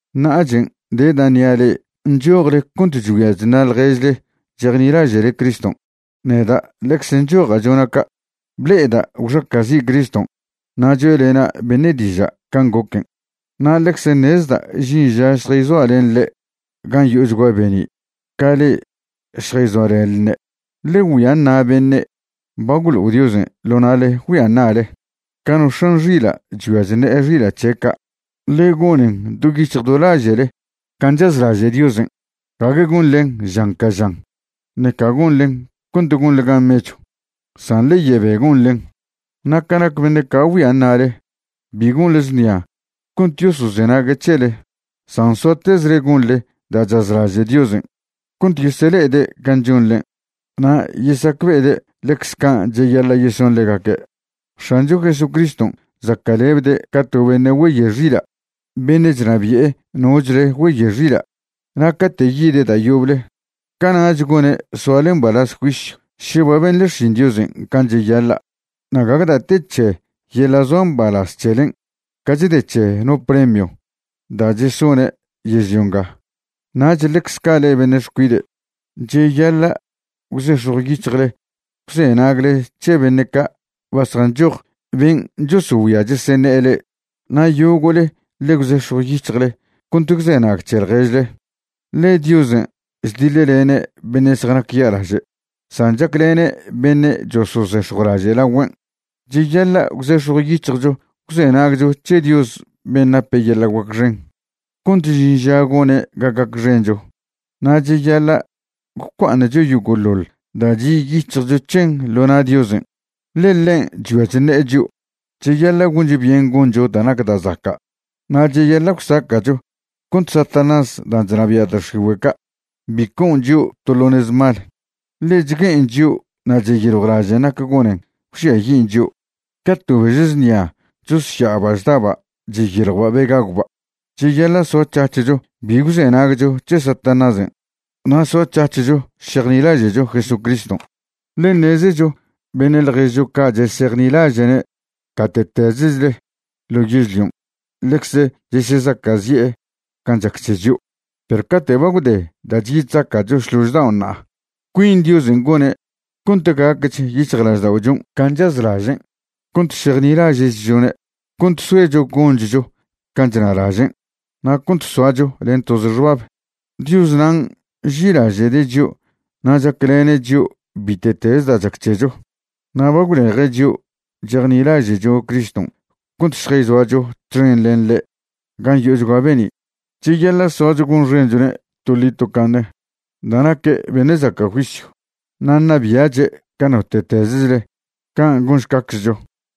Ṉa'achen' de da' ṉia' le'e nchojle cont chgüia chṉa' ḻjež le'e chejnilaže'le Criston'. Neda' ḻecze nchoja' chona' ca'. Ble'eda' gwxaca'zi' Criston' na' choe'lena' beṉe' diža' can' goquen', na' ḻecze ṉezda' žin ža šjayzoa' len ḻe' gan' yo'ochgua be'ni' ca le'e šjayzoalenḻne'. Ḻe güia ṉa' beṉe' ba gwlo'o Diosen' ḻo na'le güia ṉa'le, ca no x̱an xila' chgüia chṉe'e xila' c̱he' ca'. Ḻe gonen do yic̱hj do laže'le can' chazlaže' Diosen', gague gonḻen žan ca žan, ṉeca gonḻen cont gonḻe gan mechw, san ḻe yebe gonḻen. Na' ca nac beṉe' ca' güia ṉa'le, bi gonḻe znia cont yosozenague' c̱hele, san soatezle gonḻe da' chazlaže' Diosen' cont yesele'ede' can' chonḻen', na' yesacbe'ede' ḻecze can' cheyaḻa' yeson ḻegaque'. X̱ancho Jesucriston' zaca'lebde' ca to beṉe' güeyoe' xila' beṉe' chnabi'e nochle güeyoe' xila'. Na' cate' yide' da' yoble, cana'ch gone' soale mbalaz juisyw še ba benḻe xšin Diosen' can' cheyaḻa', na' gague da' te c̱he yeḻa' zoa mbalaz c̱helen' ca chde c̱he no premio da' chesone' yežlio nga. Nach ḻecze ca' le'e beṉe' xcuide', cheyaḻa' gwzex̱jw yic̱hjle gwzenagle c̱he beṉe' ca' ba zjanchoj ben' chosogüia chosoṉe'e le'e. Na' yogo'le ḻe gwzex̱jw yic̱hjle cont gwzenag c̱he ḻježle, ḻe: Diosen' chdiḻlene' beṉe' zjanac ya'laže', san chaclene' beṉe' chosozex̱jwlaže' lagüen'. Cheyaḻa' gwzex̱jw yic̱hjcho gwzenagcho c̱he Dios ben' nape yeḻa' guac xen, cont žin ža gone' ga gacxencho. Na' cheyaḻa' gwcua'aṉcho yogo'ḻoḻ da' chi' yic̱hjcho c̱hen ḻo na' Diosen', ḻe ḻen' chgüia chṉe'e chio'. Cheyaḻa' goncho byen goncho da' nac da' zaca', na' cheyaḻa' gwsaca'cho cont Satanás dan' chnabia' da' x̱igüe' ca' bi co'on chio' to ḻo nez mal, ḻe chgue'en chio' na' cheyiljwlažen' nac gonen gwžiayin' chio', ca to bež znia chosya'aba' chdaba' chyiljwba' be gagwba'. Cheyaḻa' soac̱hac̱hcho bi gwzenagcho c̱he Satanásen' na' soac̱hac̱hcho šejnilaže'cho Jesucriston', ḻe ṉezecho beṉe' ḻježcho ca' chesejnilaže'ne' gate'tezechle ḻo yežlion' ḻecze chesezaca'zi'e can' chac c̱he chio'. Perw cate' ba gwde da' chyi chzaca'cho šlož dao' ṉa'a, cuin Diosen' gone' cont gacch yic̱hjlažda'ochon' can' chazlažen', cont šejnilaže'chchone', cont soecho gonchcho can' chnalažen', na' cont soacho len toze xbab. Dios nan' nži'ilaže'de' chio' na' chaclene' chio' bite'teze da' chac c̱hecho, na' ba gwleje' chio' chejnilaže'cho Criston' cont šjayzoacho txen len ḻe' gan' yo'ochgua be'ni'. Cheyaḻa' soacho gonxenchone' toḻi tocaṉe da' naque' beṉe' zaca' juisyw, na' ṉabia'che' ca note'tezechle. Can' gonšcaczcho.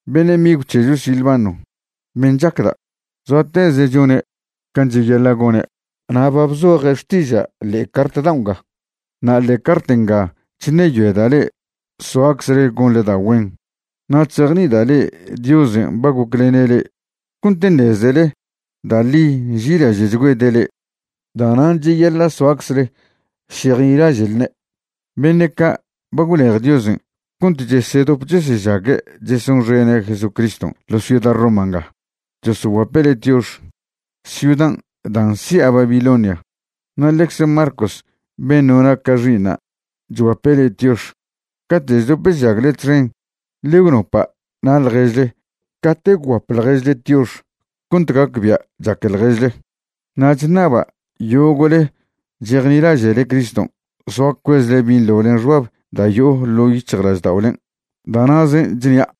Beṉe' migw c̱hecho Silvano, ben' chacda', zoateze' chone' can' cheyaḻa' gone', na' ba bzoje' xtiža' ḻe'e cart dao' nga. Na' ḻe'e cart nga chṉeyoeda' le'e soaczle gonḻe da' güen na' chzejni'ida' le'e Diosen' ba goclene' le'e cont ṉezele da' ḻi nži'ilaže'chgüede' le'e. Da'nan' cheyaḻa' soaczle šejnilaže'lne'. Beṉe' ca' ba gwlej Diosen' cont chesedop chesežague' chesonxene' Jesucriston' ḻo ciuda Roma nga chosoguape' le'e tiox, ciudan' da' nsi'a Babilonia. Na' ḻecze Marcos ben' nona' ca xi'iṉa' chguape' le'e tiox. Cate' chdop chžagle txen ḻe gwnopa' na' ḻježle cate' gwguap ḻježle tiox cont gacbia' chaque ḻježle. Na' chṉaba' yogo'le chejnilaže'le Criston' soa cuezle binḻo len xbab da' yo'o ḻo' yic̱hjlažda'olen'. Da' na'zen' chnia'.